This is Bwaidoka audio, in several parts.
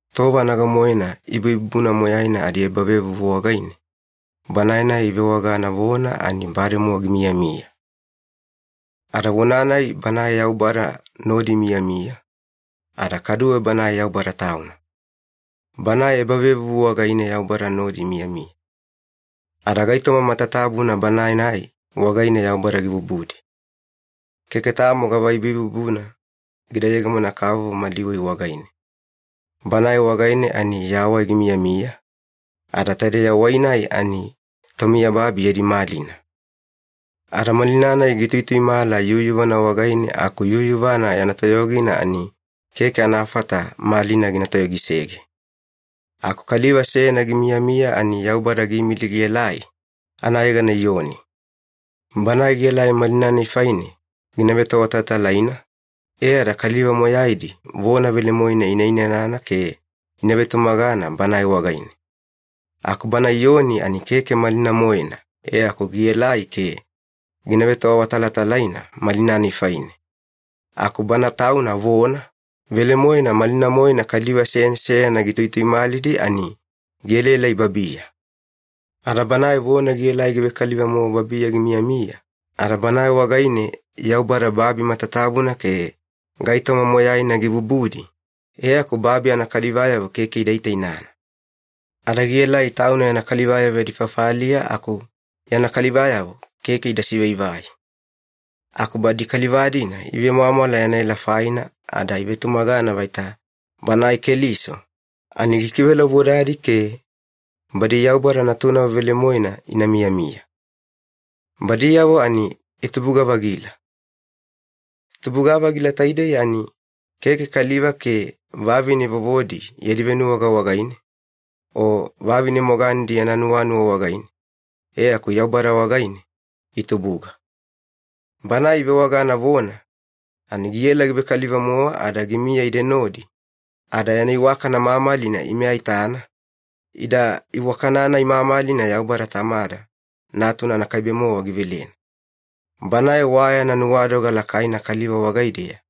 Tova nago-moena ibuibubuna moyaina adiebavevuvu wagaine, Banae-nai ivewagana Vona ani bademowa gimiyamiya. Ada Vona-nai Banae Yaubada nodi imiyamiya, ada kaduwe Banae Yaubada Tauna. Banae ebavevuvu wagaine Yaubada nodi imiyamiya. Ada gaitoma matatabuna Banae-nai wagaine Yaubada gibubudi. Keke tamo gava ibuibubuna gida yegemona-kavovo mali wai wagaine. Banae wagaine ani yawai gimiyamiya, ada taidei yawai-nai ani tomiyababi yadi malina. Ada malina-nai gituituimala yuyuvana wagaine aku yuyuvana yana toyogina ani keke anafata malina gina toyogisege. Aku kaliva seyana gimiyamiya ani Yaubada giimili gielai, anayegana Iyoni. Banae gielai malina-nai faine gina vetoawatalatalaina, e ada kaliva moyaidi vona velemoena ina inanana ke ina vetumagana Banae wagaine. Aku bana Iyoni ani keke malina-moena e aku gielai ke gina vetoawatalatalaina malina-nai faine. Aku Bana Tauna Vona, velemoena malina-moena kaliva seyana seyana gituituimalidi ani gielaelai babiya. Ada Banae Vona gielai givekaliva-mowa babiya gimiyamiya, ada Banae wagaine Yaubada babi matatabuna ke gaitoma moyaina gibubudi, e aku babi anakalivayavo keke ida itainana. Ada gielai Tauna yana kalivayavo yadi fafaliya aku yana kalivayavo keke ida sivaivai. Aku badi kaliva-dina ivemwamwala yana ela faina ada ivetumagana vaita Banae Keliso ani gikivelaubodadi ke badi Yaubada natunavo velemoena ina miyamiya. Badiyavo ani itubuga-vagila. Tubuga-vagila taidei ani keke kaliva ke vavine vovodi yadi venuwaga wagaine, o vavine moganedi yana nuwanuwa wagaine, e aku Yaubada wagaine itubuga. Banae ivewagana ‘Vona’ ani giela givekaliva-mowa ada gimiya ide nodi, ada yana iwakana mamalina ime aitana, ida iwakana-nai mamalina Yaubada Tamada Natuna anakaibe-mowa givelena. Banae wa yana nuwadoga lakaina kaliva wagaideya,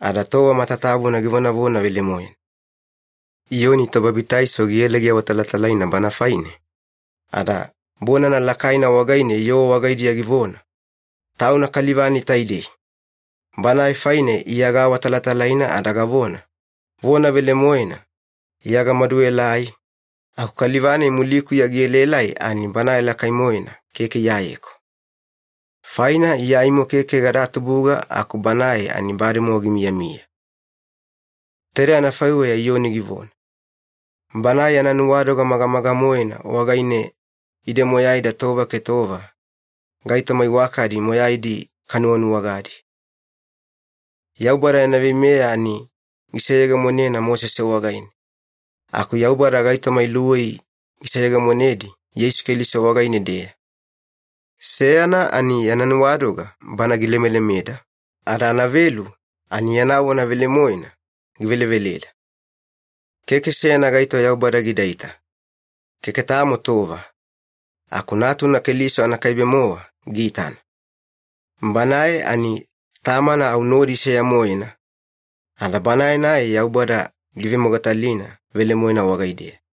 ada tova matatabuna givonavona velemoena. Iyoni Tobabitaiso giela giawatalatalaina Banae faine, ada bonana lakaina wagaine yoo wagaidiya givona, “Tauna kaliva-nai taidei, Banae faine Iya gaawatalatalaina ada gavona, ‘Vona velemoena Iya gamaduelai, aku kaliva-nai mulikuya gielaelai ani Banae lakai-moena, keke Iyayeku. Faina Iya aimo keke gada tubuga aku Banae ani bademowa gimiyamiya.’” Taidei anafaiweya Iyoni givona. Banae yana nuwadoga magamaga-moena wagaine ide moyaida tova ke tova gaitoma iwakadi moyaidi kanuwanuwagadi. Yaubada yana veimeya ani giseyegemonena Mosese wagaine. Aku Yaubada gaitoma iluwei giseyegemonedi Yeisu Keliso wagaine-deya. Seyana ani yana nuwadoga bana gilemelemeda, ada anavelu ani yana vona velemoena giveleveleda. Keke seyana gaito Yaubada gidaita, keke tamo tova, aku Natuna Keliso anakaibe-mowa giitana. Banae ani Tamana au nodi seya-moena, ada Banae-nai Yaubada giivemogatalina velemoena wagaideya.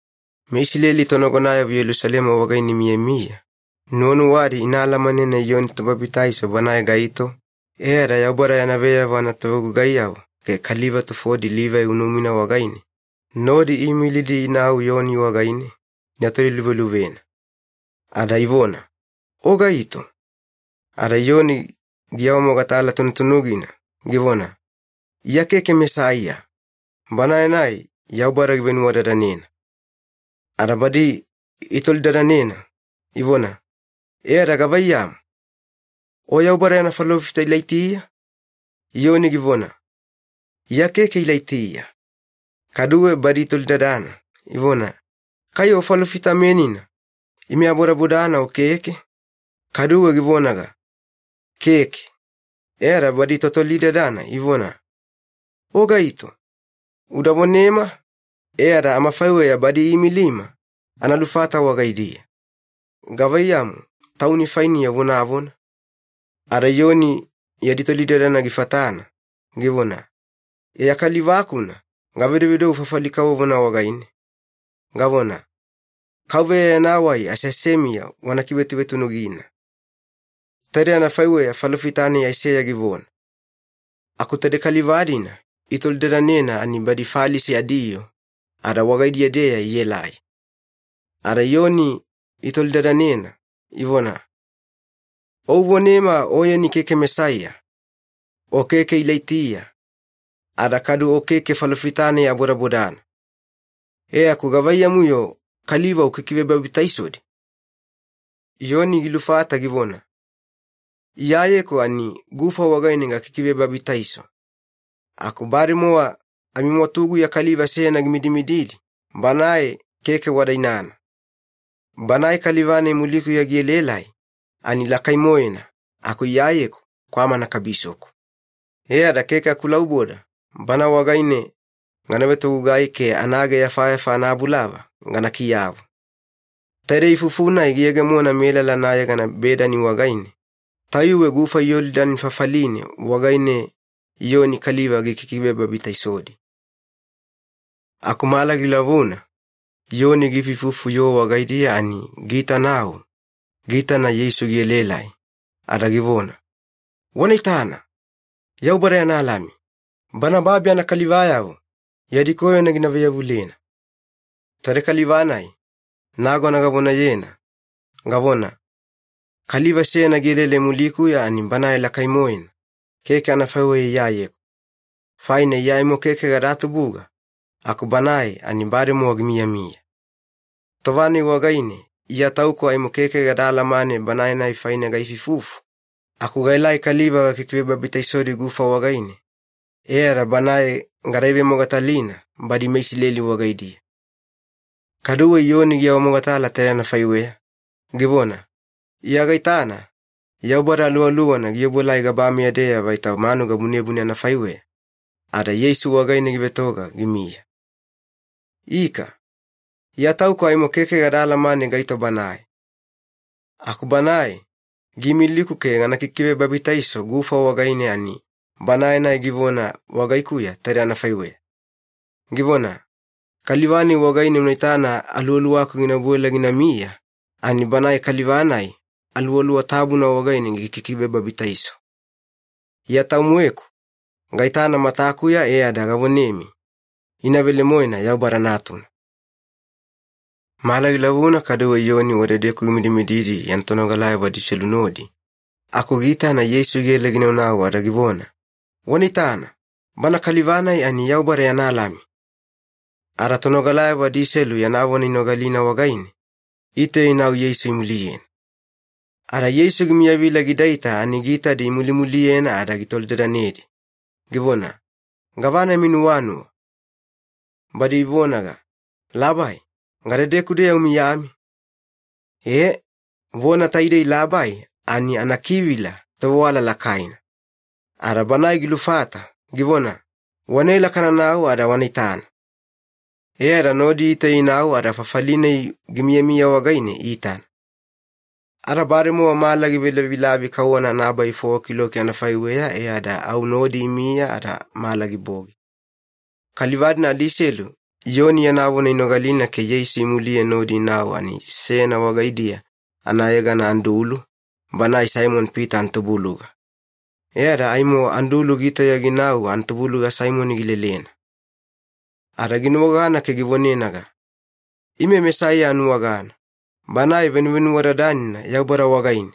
MeIsileli tonagonayavo Yelusalema wagaine imiyamiya nuwanuwadi ina alamanena Iyoni Tobabitaiso banae gaito, e ada Yaubada yana veyavo anatovegugaiyavo ke kaliva tufodi Livai unumina wagaine nodi iimilidi inau Iyoni wagaine ina toliluveluvena. Ada ivona, “O gaito?” Ada Iyoni giawamogatala tunutunugina, givona, “Iya keke Mesaiya, Banae-nai Yaubada givenuwadadanena.” Ada badi itolidadanena, ivona, “E ada gavaiyamu? O Yaubada yana falofita Ilaitiya?” Iyoni givona, “Iya keke Ilaitiya.” Kaduwe badi itolidadana, ivona, “Kai o Falofita-menina ime abodabodana o keke?” Kaduwe givonaga, “Keke.” E ada badi totolidadana ivona, “O gaito? Uda vonema e ada amafaiweya badi iimilima ana lufata wagaidiya. Gavaiyamu tauni fainiya uvonavona?” Ada Iyoni yadi tolidadana gifatana, givona, “Iya kaliva-kuna gavedovedou fafali kavovona wagaine, gavona, ‘KAUVEYA yana wai aseasemiya wana kivetunutunugina.’ Taidei anafaiweya falofita-nai Aiseya givona.” Aku taidei kaliva-dina itolidadanena ani badi Falisi adiyoo, ada wagaidiya-deya ielai. Ada Iyoni itolidadanena, ivona, “O uvonema oyeni keke Mesaiya, o keke Ilaitiya, ada kadu o keke falofita-nai abodabodana. E aku gavaiyamu-yo kaliva ukikivebabitaisodi?” Iyoni gilufata givona, “Iyayeku ani gufa wagaine gakikivebabitaiso, aku bademowa amimwatuguya kaliva seyana gimidimididi Banae keke wada inana. Banae kaliva-nai mulikuya gielaelai ani lakai-moena aku Iyayeku kwamana kabisoku. E ada keke akulauboda Bana wagaine gana vetogugai ke anaageyafayafa anabulava gana kiyavu.” Taidei ifufu-nai giyegemona melala anayegana Bedani wagaine, tayuwe gufa Yolidani fafaline wagaine Iyoni kaliva gikikivebabitaisodi. Aku mala gilavuna Iyoni giifuifufu yoo wagaidiya ani giitanau giitana Yeisu gielaelai, ada givona, “Wana itana, Yaubada yana Lami Bana babi anakalivayavo yadi koyona gina vaiyavulena! Taidei kaliva-nai nagona gavonayena, gavona, ‘Kaliva seyana gielaelai mulikuya ani Banae lakai-moena keke anafaiweya Iyayeku, faina Iya aimo keke gada tubuga aku Banae ani bademowa gimiyamiya.’ Tova-nai wagaine Iya Tauku aimo keke gada alamane Banae-nai faine gaifuifufu, aku gaelai kaliva gakikivebabitaisodi gufa wagaine e ada Banae gada ivemogatalina badi meIsileli wagaidiya.” Kaduwe Iyoni giawamogatala taidei anafaiweya, givona, “Iya gaitana Yaubada Aluwaluwana giobuelai gabameya-deya vaita manuga bunebune anafaiweya, ada Yeisu wagaine givetoga gimiya. Ika, Iya Tauku aimo keke gada alamane gaito Banae. Aku Banae giimiliku ke gana kikivebabitaiso gufa wagaine ani Banae-nai givona wagaikuya taidei anafaiweya, givona, ‘Kaliva-nai wagaine una itana Aluwaluwaku gina obuela ginamiya ani Banae kaliva-nai Aluwaluwa Tabuna wagaine gikikivebabitaiso.’ Iya tau-moeku gaitana matakuya e ada gavonemi, ina velemoena Yaubada Natuna.” Mala gilavuna kaduwe Iyoni wadedeku gimidimididi yana tonogalayavo adiselu nodi aku giitana Yeisu giela ginaunau ada givona, “Wana itana, Banae Kaliva-nai ani Yaubada yana Lami!” Ada tonogalayavo adiselu yana vona inogalina wagaine, itauya inau Yeisu imuliyena. Ada Yeisu gimiyavila gidaita ani giitadi imulimuliyena ada gitolidadanedi, givona, “Gavana yami nuwanuwa?” Badi ivonaga, “Labai, gadedeku-deya umiyami?” E, vona taidei ‘labai’ ani anakivila ‘tovewala lakaina’. Ada banae gilufata, givona, “Wanaela kananau ada wana itana.” E ada nodi itauya inau ada fafali-nai gimiyamiya wagaine iitana. Ada bademowa mala givelavilavi kauwana anabai fowa kiloki anafaiweya, e ada au nodi imiya ada mala gibogi. Kaliva-dina adiselu Iyoni yana vona inogalina ke Yeisu imuliye nodi inau ani seyana wagaidiya anayegana Andulu, banae Saimoni-Pita anatubuluga. E ada aimo Andulu gitauya ginau anatubuluga Saimoni gilelena. Ada ginuwagana ke givonenaga, “Ime Mesaiya anuwagana, Banae Venuvenuwadadanina Yaubada wagaine!”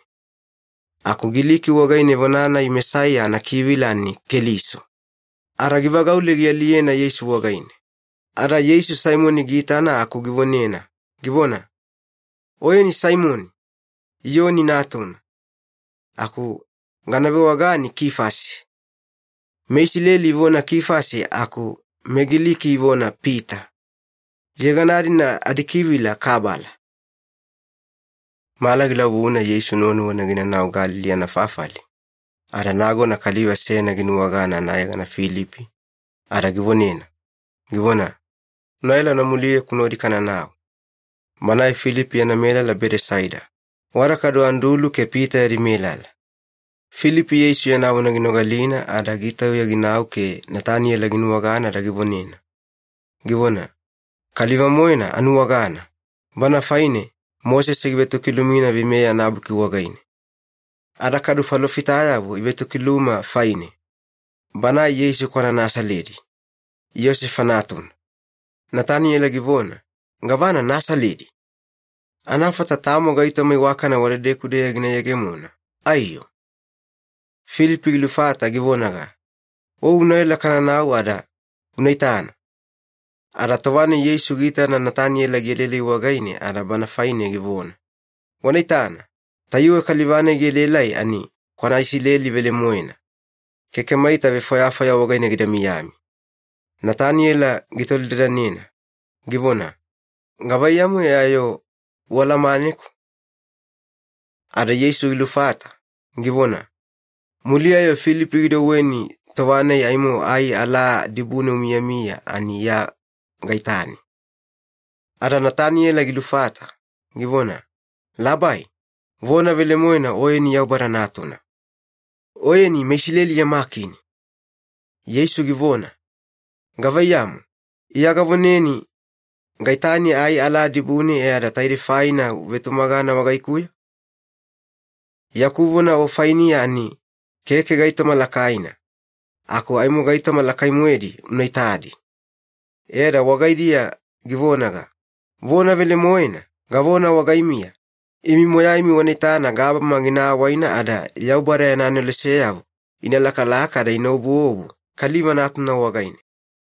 (Aku Giliki wagaine vona-nai ‘Mesaiya’ anakivila ani ‘Keliso’.) Ada givagaule gialiyena Yeisu wagaine. Ada Yeisu Saimoni giitana aku givonena, givona, “Oyeni Saimoni, Iyoni natuna. Aku gana vewagani ‘Kifasi’.” (MeIsileli ivona ‘Kifasi’ aku meGiliki ivona ‘Pita’. Yegana-dina adikivila ‘kabala’.) Mala gilavuna Yeisu nuwanuwana ginanau Galili anafafali, ada nagona kaliva seyana ginuwagana anayegana Filipi, ada givonena, givona, “Unaela una muliyeku nodi kananau.” Banae Filipi yana melala Bedesaida, wada kadu Andulu ke Pita yadi melala. Filipi Yeisu yana vona ginogalina ada gitauya ginau ke Nataniyela ginuwagana, ada givonena, givona, “Kaliva-moena anuwagana, Bana faine Mosese givetokilumina Veimeya anabuki wagaine. Ada kadu falofitayavo ivetokiluma faine. Banae Yeisu kwana Nasaledi, Iyosefa natuna.” Nataniyela givona, “Gavana Nasaledi! Anafata tamo gaitoma iwakana wadedeku-deya gina yegemona, aiyo?” Filipi gilufata givonaga, “O unaela kananau ada una itana.” Ada tova-nai Yeisu giitana Nataniyela gielaelai wagaine ada bana faine givona, “Wana itana, tayuwe kaliva-nai gielaelai ani kwana Isileli velemoena. Keke maita vefwayafwaya wagaine gida miyami.” Nataniyela gitolidadanena, givona, “Gavaiyamu e ayo o ualamaneku?” Ada Yeisu gilufata, givona, “Muliya-yo Filipi gidouweni, tova-nai aimo ai alaa dibune umiyamiya ani Iya gaitani.” Ada Nataniyela gilufata, givona, “Labai, vona velemoena Oyeni Yaubada Natuna! Oyeni meIsileli yama Kini!” Yeisu givona, “Gavaiyamu, Iya gavoneni gaitani ai alaa dibune e ada taidei faina uvetumagana wagaikuya? Yaku vona o fainiya ani keke gaitoma lakaina, aku aimo gaitoma lakai-moedi una itadi.” E ada wagaidiya givonaga, “Vona velemoena, gavona wagaimiya, imi moyaimi wana itana gabama gina awaina ada Yaubada yana aneloseyavo ina lakalaka ada ina obuobu Kaliva Natuna wagaine.”